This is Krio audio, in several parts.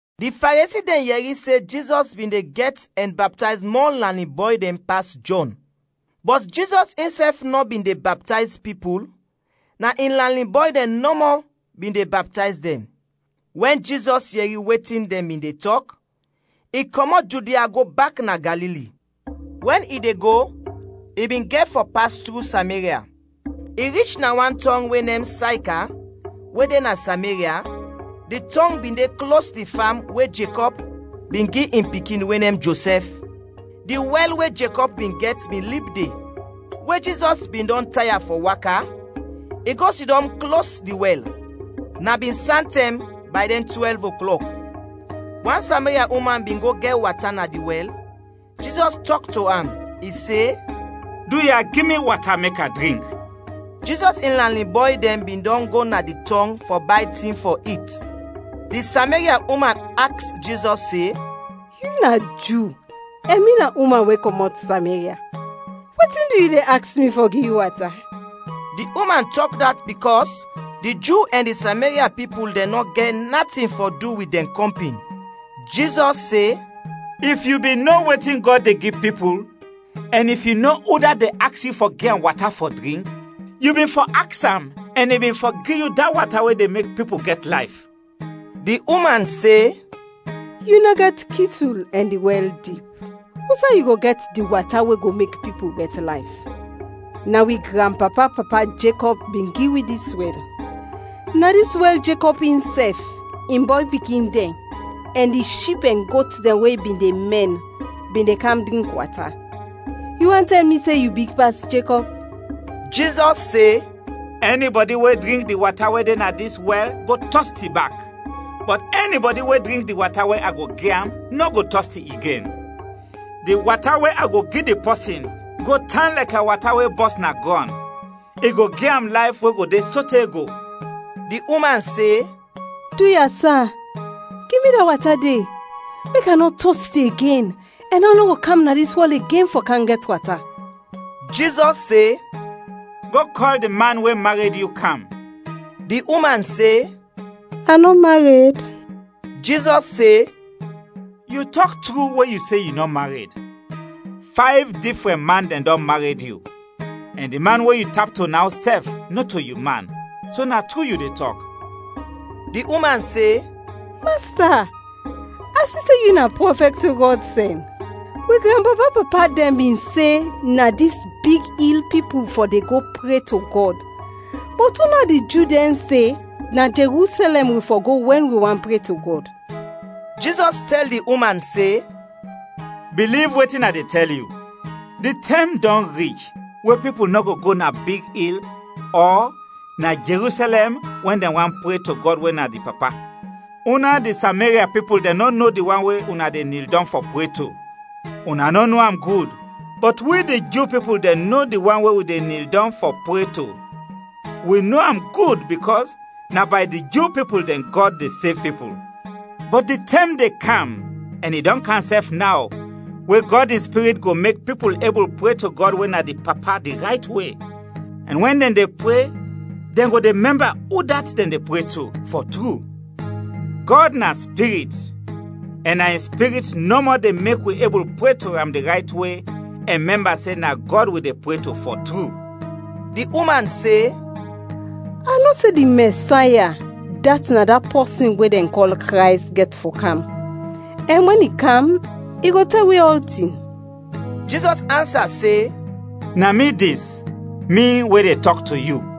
Di Faresi dɛn yɛri se Jizɔs bin de gɛt ɛn baptayz mɔ lanin bɔy dɛn pas Jɔn. Bɔt Jizɔs insɛf nɔ bin de baptayz pipul, na in lanin bɔy dɛn nɔmɔ bin de baptayz dɛn. Wɛn Jizɔs yɛri wetin dɛn bin de tɔk, i kɔmɔt Judia go bak na Galili. Wɛn i de go, i bin gɛt fɔ pas tru Sameria. I rich na wan tɔng we nem Sayka we de na Sameria, di tɔng bin de klos di fam we Jekɔb bin gi in pikin we nem Josɛf. Di wɛl we Jekɔb bin gɛt bin lib de; we Jizɔs bin dɔn taya fɔ waka, i go sidɔm klos di wɛl. Na bin santɛm, bay dɛn twɛlv oklɔk. Wan Sameria uman bin go gɛt wata na di wɛl, Jizɔs tɔk to am, i se, “Duya, gi mi wata mek a drink.” Jizɔs in lanin bɔy dɛn bin dɔn go na di tɔng fɔ bay tin fɔ it. Di Sameria uman aks Jizɔs se, “Yu na Ju ɛn mi na uman we kɔmɔt Sameria. Wetin du yu de aks mi fɔ gi yu wata?” Di uman tɔk dat bikɔs di Ju ɛn di Sameria pipul dɛn nɔ gɛt natin fɔ du wit dɛn kɔmpin. Jizɔs se, “If yu bin no wetin Gɔd de gi pipul, ɛn if yu no udat de aks yu fɔ gi am wata fɔ drink, yu bin fɔ aks am ɛn i bin fɔ gi yu da wata we de mek pipul gɛt layf.” Di uman se, “Yu nɔ gɛt kitul ɛn di wɛl dip; usay yu go gɛt di wata we go mek pipul gɛt layf? Na wi granpapa-papa Jekɔb bin gi wi dis wɛl. Na dis wɛl Jekɔb insɛf, in bɔy pikin dɛn, ɛn di ship ɛn got dɛn we i bin de mɛn bin de kam drink wata. Yu want tɛl mi se yu big pas Jekɔb?” Jizɔs se, “Ɛnibɔdi we drink di wata we de na dis wɛl go tɔsti bak; bɔt ɛnibɔdi we drink di wata we a go gi am nɔ go tɔsti igen. Di wata we a go gi di pɔsin go tan lɛkɛ wata we bɔs na grɔn, i go gi am layf we go de sote go.” Di uman se, “Duya, sa, gi mi da wata de; mek a nɔ tɔsti igen, ɛn a nɔ go kam na dis wɛl igen fɔ kam gɛt wata.” Jizɔs se, “Go kɔl di man we mared yu kam.” Di uman se, “A nɔ mared.” Jizɔs se, “Yu tɔk tru we yu se yu nɔ mared. Fayv difrɛn man dɛn dɔn mared yu, ɛn di man we yu tap to naw sɛf, nɔto yu man, so na tru yu de tɔk.” Di uman se, “Masta, a si se yu na prɔfɛt we Gɔd sɛn. Wi granpapa-papa dɛn bin se na dis big il pipul fɔ de go pre to Gɔd, bɔt una di Ju dɛn se na Jerusɛlɛm wi fɔ go wɛn wi want pre to Gɔd.” Jizɔs tɛl di uman se, “Biliv wetin a de tɛl yu. Di tɛm dɔn rich we pipul nɔ go go na big il ɔ na Jerusɛlɛm wɛn dɛn want pre to Gɔd we na di Papa. Una di Sameria pipul dɛn nɔ no di wan we una de nil dɔng fɔ pre to, una nɔ no am gud, bɔt wi di Ju pipul dɛn no di wan we wi de nil dɔng fɔ pre to, wi no am gud bikɔs na bay di Ju pipul dɛn Gɔd de sev pipul. Bɔt di tɛm de kam ɛn i dɔn kam sɛf naw we Gɔd in Spirit go mek pipul ebul pre to Gɔd we na di Papa di rayt we, ɛn wɛn dɛn de pre dɛn go de mɛmba udat dɛn de pre to, fɔ tru. Gɔd na Spirit, ɛn na in Spirit nɔmɔ de mek wi ebul pre to am di rayt we, ɛn mɛmba se na Gɔd wi de pre to, fɔ tru.” Di uman se, “A no se di Mɛsaya, dat na da pɔsin we dɛn kɔl Krays, gɛt fɔ kam; ɛn wɛn i kam, i go tɛl wi ɔltin.” Jizɔs ansa se, “Na mi dis, mi we de tɔk to yu.”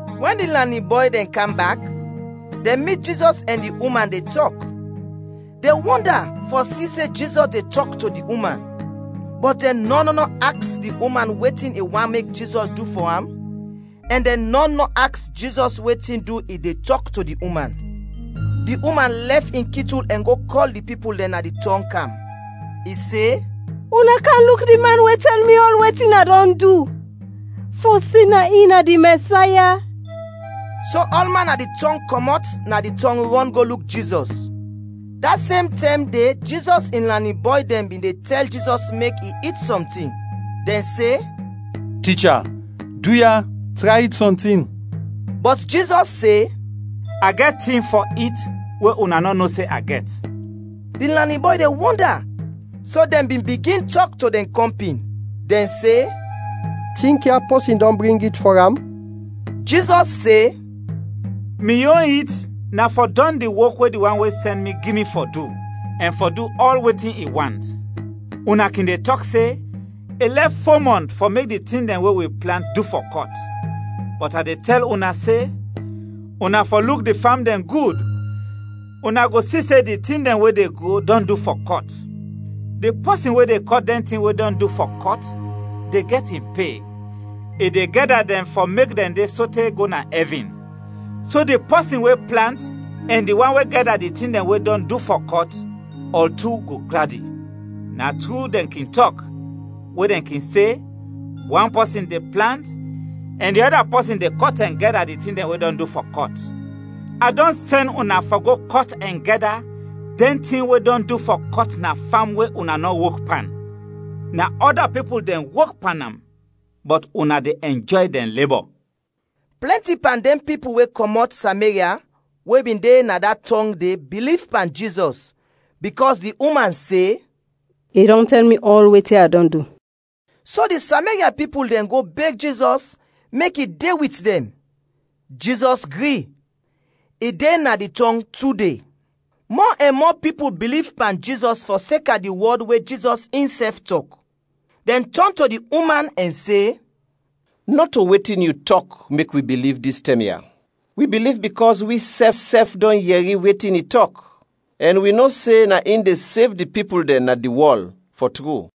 Wɛn di lanin bɔy dɛn kam bak, dɛn mit Jizɔs ɛn di uman de tɔk. Dɛn wɔnda fɔ si se Jizɔs de tɔk to di uman. Bɔt dɛn nɔn nɔ aks di uman wetin i want mek Jizɔs du fɔ am, ɛn dɛn nɔn nɔ aks Jizɔs wetin du i de tɔk to di uman. Di uman lɛf in kitul ɛn go kɔl di pipul dɛn na di tɔng kam. I se, “Una kam luk di man we tɛl mi ɔl wetin a dɔn du; fɔ se na in na di Mɛsaya?” So ɔlman na di tɔng kɔmɔt na di tɔng rɔn go luk Jizɔs. Da sem tɛm de Jizɔs in lanin bɔy dɛn bin de tɛl Jizɔs mek i it sɔntin, dɛn se, “Ticha, duya, tray it sɔntin!” Bɔt Jizɔs se, “A gɛt tin fɔ it we una nɔ no se a gɛt.” Di lanin bɔy dɛn wɔnda, so dɛn bin bigin tɔk to dɛn kɔmpin, dɛn se, “Tinkya, pɔsin dɔn bring it fɔ am?” Jizɔs se, “Mi yon it na fɔ dɔn di wok we di wan we sɛn mi gi mi fɔ du, ɛn fɔ du ɔl wetin i want. Una kin de tɔk se: ‘I lɛf fo mɔnt fɔ mek di tin dɛn we wi plant du fɔ kɔt.’ Bɔt a de tɛl una se, una fɔ luk di fam dɛn gud, una go si se di tin dɛn we de gro dɔn du fɔ kɔt! Di pɔsin we de kɔt dɛn tin we dɔn du fɔ kɔt de gɛt in pe, i de gɛda dɛn fɔ mek dɛn de sote go na ɛvin. So di pɔsin we plant ɛn di wan we gɛda di tin dɛn we dɔn du fɔ kɔt, ɔl tu go gladi. Na tru dɛn kin tɔk, we dɛn kin se, ‘Wan pɔsin de plant, ɛn di ɔda pɔsin de kɔt ɛn gɛda di tin dɛn we dɔn du fɔ kɔt.’ A dɔn sɛn una fɔ go kɔt ɛn gɛda dɛn tin we dɔn du fɔ kɔt na fam we una nɔ wok pan; na ɔda pipul dɛn wok pan am, bɔt una de ɛnjɔy dɛn lebɔ.” Plɛnti pan dɛn pipul we kɔmɔt Sameria we bin de na da tɔng de biliv pan Jizɔs, bikɔs di uman se, “I dɔn tɛl mi ɔl wetin a dɔn du.” So di Sameria pipul dɛn go beg Jizɔs mek i de wit dɛn; Jizɔs gri. I de na di tɔng tu de. Mɔ ɛn mɔ pipul biliv pan Jizɔs fɔseka di wɔd we Jizɔs insɛf tɔk. Dɛn tɔn to di uman ɛn se, “Nɔto wetin yu tɔk mek wi biliv dis tɛm ya; wi biliv bikɔs wisɛf sɛf dɔn yɛri wetin i tɔk, ɛn wi no se na in de sev di pipul dɛn na di wɔl, fɔ tru.”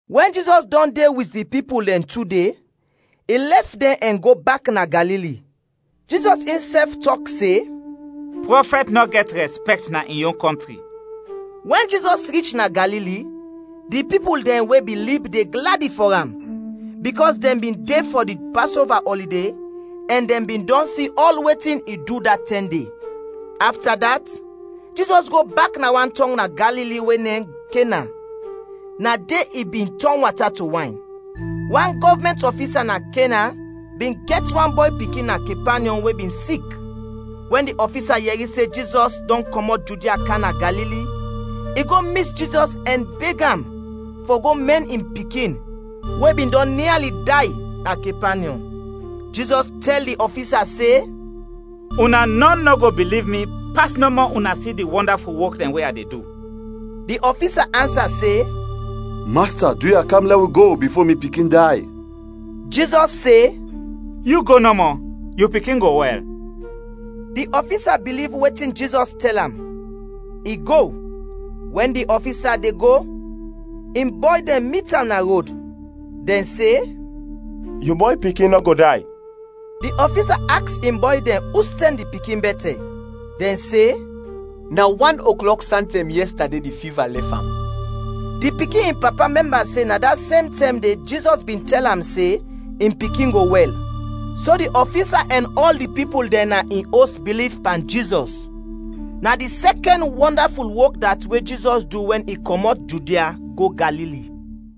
Wɛn Jizɔs dɔn de wit di pipul dɛn tu de, i lɛf dɛn ɛn go bak na Galili. Jizɔs insɛf tɔk se, “Prɔfɛt nɔ gɛt rɛspɛkt na in yon kɔntri.” Wɛn Jizɔs rich na Galili, di pipul dɛn we bin lib de gladi fɔ am, bikɔs dɛn bin de fɔ di Pasova ɔlide ɛn dɛn bin dɔn si ɔl wetin i du da tɛm de. Afta dat, Jizɔs go bak na wan tɔng na Galili we nem Kena, na de i bin tɔn wata to wayn. Wan gɔvmɛnt ɔfisa na Kena bin gɛt wan bɔy pikin na Kepanyɔm we bin sik. Wɛn di ɔfisa yɛri se Jizɔs dɔn kɔmɔt Judia kam na Galili, i go mit Jizɔs ɛn beg am fɔ go mɛn in pikin we bin dɔn niali day na Kepanyɔm. Jizɔs tɛl di ɔfisa se, “Una nɔn nɔ go biliv mi pas nɔmɔ una si di wɔndaful wok dɛn we a de du.” Di ɔfisa ansa se, “Masta, duya, kam lɛ wi go bifo mi pikin day.” Jizɔs se, “Yu go nɔmɔ, yu pikin go wɛl!” Di ɔfisa biliv wetin Jizɔs tɛl am. I go. Wɛn di ɔfisa de go, in bɔy dɛn mit am na rod. Dɛn se, “Yu bɔy pikin nɔ go day!” Di ɔfisa aks in bɔy dɛn ustɛm di pikin bɛtɛ, dɛn se, “Na wan oklɔk santɛm yɛstade di fiva lɛf am.” Di pikin in papa mɛmba se na da sem tɛm de Jizɔs bin tɛl am se in pikin go wɛl. So di ɔfisa ɛn ɔl di pipul dɛn na in os biliv pan Jizɔs. Na di sɛkɛn wɔndaful wok dat we Jizɔs du wɛn i kɔmɔt Judia go Galili.